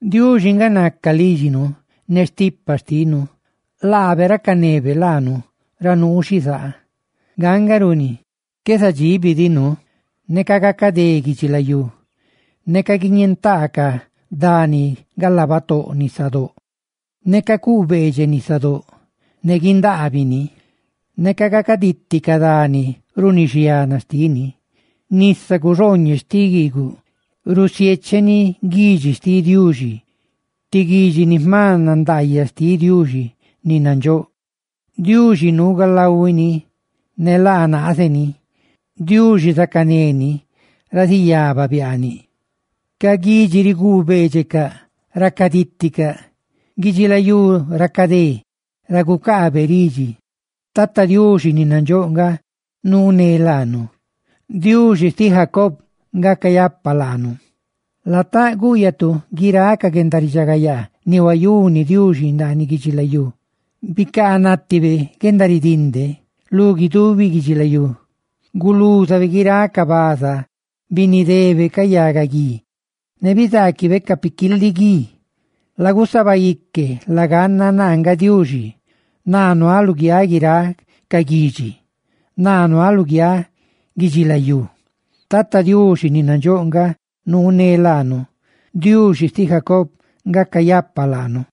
Diuxi nga naca lídxinu ne stipa xtinu; laabe racanebe laanu ra nuunu xizaa. Nga nga runi qué zadxíbidinu neca gacadé guidxilayú, neca guidiñentaa ca dani galaa batóꞌ nisadóꞌ, neca cuꞌ beedxeꞌ nisadóꞌ ne guindaabini, neca gacaditi ca dani runi xiana xtini. Nisa cuxooñeꞌ xtiꞌ guiiguꞌ rusiécheni guidxi xtiꞌ Diuxi, ti guidxi ni jma nandaayaꞌ xtiꞌ Diuxi ni nandxóꞌ. Diuxi nuu galahuini ne laa naaze ni; Diuxi zacané ni ra ziyaba biaaniꞌ. Ca guidxi riguu beedxecaꞌ, racadíticaꞌ, guidxilayú racadé ra gucaabe ridxi. ¡Tata Diuxi ni nadxóꞌ nga nuu ne laanu! ¡Diuxi xtiꞌ Jacob nga cayapa laanu! Lataꞌ gúꞌyatu guiráꞌ ca guendaridxagayaa ni huayuni Diuxi ndaaniꞌ guidxilayú: bicaa nátibe guendaridinde lu guidubi guidxilayú; gulúzabe guiráꞌ ca baza, binidebe ca yagaguí, ¡ne bizaaquibe ca piquiiliguía! «¡Lagusaba ique! ¡Laganna naa nga Diuxi! ¡Naa nuaꞌ luguiáꞌ guiráꞌ ca guidxi! ¡Naa nuaꞌ luguiáꞌ guidxilayú!» ¡Tata Diuxi ni nadxóꞌ nga nuu ne laanu! ¡Diuxi xtiꞌ Jacob nga cayapa laanu!